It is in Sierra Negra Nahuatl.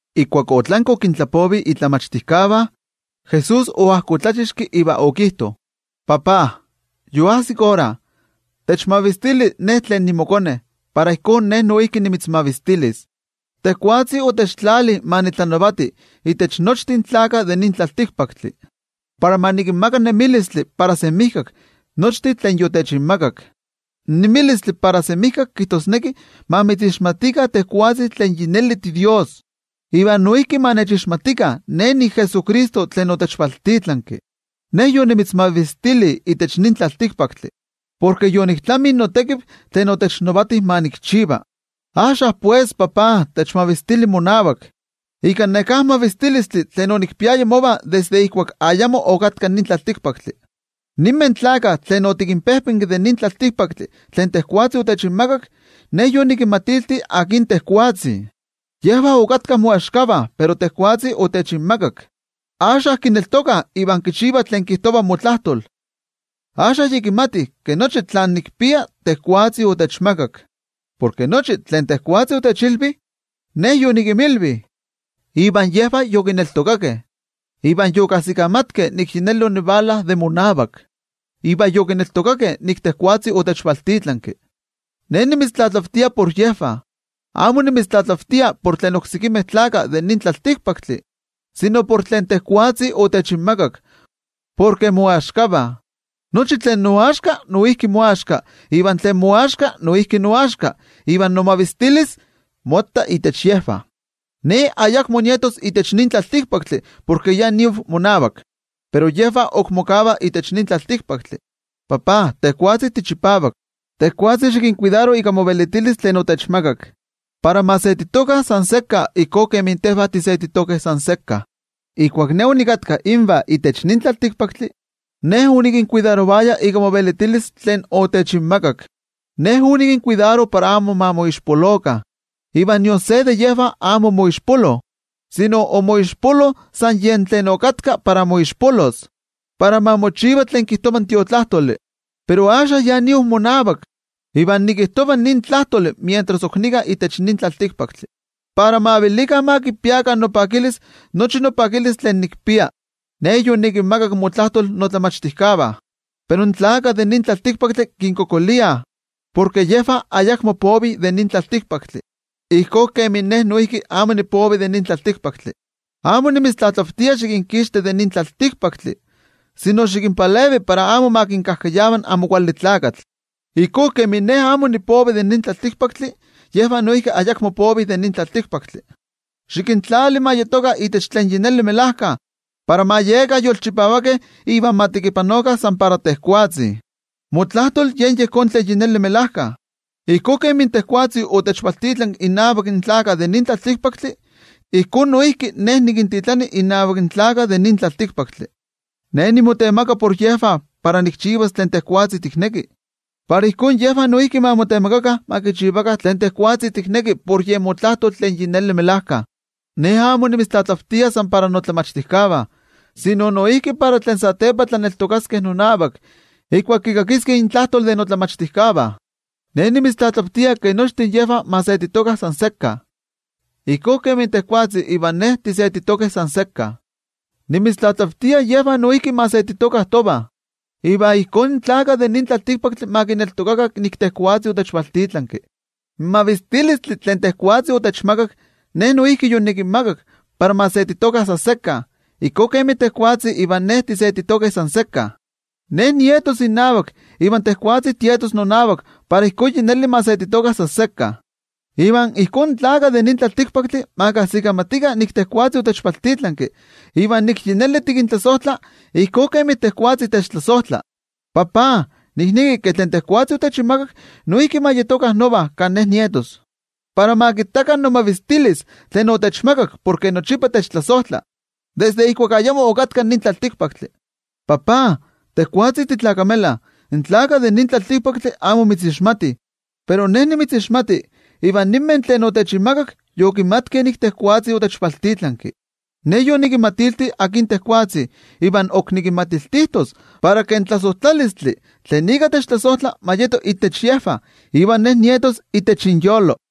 Ijkuak otlanki okintlapovi in momachtijkeh, Jesús oajkotlachixki iva okijto: —NoTajtzi, yoajsik ora. Xikmavistili moKone, para Ye noijki ma mitzmavistili. Tejwatzi otiktlali ma tlanavati itech nochtin tlaltikpaktlakah, para ma kinmaka nemilistli para semijkak nochtin tlen yotikinmakak. In nemilistli para semijkak kijtosneki ma mitzixmatikah tejwatzi tlen yi neli tiDios, iva noijki ma kixmatikah in Jesucristo tlen otikvaltitlanki. ’Ne yonimitzmavistili itech nin tlaltikpaktli, porke yoniktlami notekiv tlen otechnavati ma nikchiva. Axka pues, noTajtzi, techmaka monavak in mavistilistli tlen onikpiaya mova desde ijkuak ayamo okatka nin tlaltikpaktli. ’Ninmeh gentejtih tlen otikinpejpenki de nin tlaltikpaktli tlen tejwatzi otechinmakak, Ne yonikinmatilti akin tejwatzi. Yejvah okatkah moaxkavah, pero tejwatzi otechinmakak, axka kineltokah iva kichivah tlen kijtova motlajtol. Axka yi kimatih ke nochi tlen nikpia tejwatzi otechmakak. Porke nochi tlen tejwatzi otechilvi, Ne yonikinmilvi, iva yejvah yokineltokakeh. Iva yokajsikamatkeh nik yi neli onivala de monavak, iva yokineltokakeh nik tejwatzi otechvaltitlanki. ’Ne nimitztlatlavtia por yejvah. Amo nimitztlatlavtia por tlen oksekimeh tlaltikpaktlakah, sino por tlen tejwatzi otechinmakak, porke moaxkavah. Nochi tlen noaxka, noijki moaxka, iva tlen moaxka, noijki noaxka. Iva nomavistilis motta intech yejvah. ’Ne ayakmo nietos itech nin tlaltikpaktli porke yi niav monavak, pero yejvah ok mokavah itech nin tlaltikpaktli. NoTajtzi, tejwatzi tichipavak, tejwatzi xikinkuidaro ika movelitilis tlen otechinmakak, para ma setitokah san sekka ijkó kemi tejvah tisetitokeh san sekka. Ijkuak Ne onikatka invah itech nin tlaltikpaktli, Ne onikinkuidarovaya ika movelitilis tlen otechinmakak. Ne onikinkuidaro para amo ma moixpolokah, iva nion se de yejvah amo omoixpolo, sino omoixpolo san yen tlen yokatka para moixpolos, para ma mochiva tlen kijtova in Tiotlajkuiloli. ’Pero axka ya niav monavak. Iva nikijtova nin tlajtoli mientras ok nika itech nin tlaltikpaktli, para ma velikah ma kipiakah nopakilis, nochi nopakilis tlen nikpia. Ne yonikinmakak motlajtol tlen momachtijkeh, pero in tlaltikpaktlakah kinkualankaitah, porke yejvah ayakmo povih de nin tlaltikpaktli, ijkó kemin Ne noijki amo nipovi de nin tlaltikpaktli. Amo nimitztlatlavtia xikinkixti de itech nin tlaltikpaktli, sino xikinpalevi para amo ma kinkajkayava in Amo Kuali Tlakatl. Ijkó kemin Ne amo nipovi de nin tlaltikpaktli, yejvah noijki ayakmo povih de nin tlaltikpaktli. Xikintlali ma yetokah itech tlen yi neli melajka para ma yekah yolchipavakeh iva ma tekipanokah san para tejwatzi. Motlajtol yen yejón tlen yi neli melajka. Ijkó kemi tejwatzi otechvaltitlanki innavak in tlaltikpaktlakah, ijkó noijki Ne nikintitlani innavak in tlaltikpaktlakah. Ne nimotemaktia por yejvah para nikchivas tlen tejwatzi tikneki, para ijkó yejvah noijki ma motemaktikah ma kichivakah tlen tejwatzi tikneki por yen motlajtol tlen melajkayotl. ’Ne amo nimitztlatlavtia san para yejvah tlen nikinmachtia, sino noijki para tlen satepa tlaneltokaskeh nonavak ijkuak kikakiskeh intlajtol de tlen nikinmachtia. Ne nimitztlatlavtia ke nochtin yejvah ma setitokah san sekka. Ijkó kemi tejwatzi ivan Ne, tisetitokeh san sekka. Nimitztlatlavtia yejvah noijki ma setitokah tovah. Iva ijkó in tlaltikpaktlakah ma kineltokakah nik tejwatzi otechvaltitlanki. In mavistilistli tlen otechmakak tejwatzi, Ne noijki yonikinmakak para ma setitokah san sekka ijkó kemi tejwatzi ivan Ne tisetitokeh san sekka. Ne nietos innavak, iva tejwatzi tietos nonavak para ijkó yi neli ma setitokah san sekka. Iva ijkó in tlaltikpaktlakah ma kajsikamatikah nik tejwatzi otechvaltitlanki, iva nik yi neli tikintlasojtla ijkó kemi tejwatzi techtlasojtla. ’NoTajtzi, nikneki ke tlen tejwatzi otechinmakak noijki ma yetokah nova kan Ne nietos, para ma kittakah nomavistilis tlen otechmakak porke nochipa techtlasojtla desde ijkuak ayamo okatka nin tlaltikpaktli. NoTajtzi, tejwatzi titlakamela, in tlaltikpaktlakah amo mitzixmatih, pero Ne nimitzixmati, iva ninmeh tlen otechinmakak yokimatkeh nik tejwatzi otechvaltitlanki. Ne yonikinmatilti akin tejwatzi, iva ok nikinmatiltijtos, para ke in tlasojtlalistli tlen ika techtlasojtla ma yeto intech yejvah, iva Ne noijki nietos intech yejvah.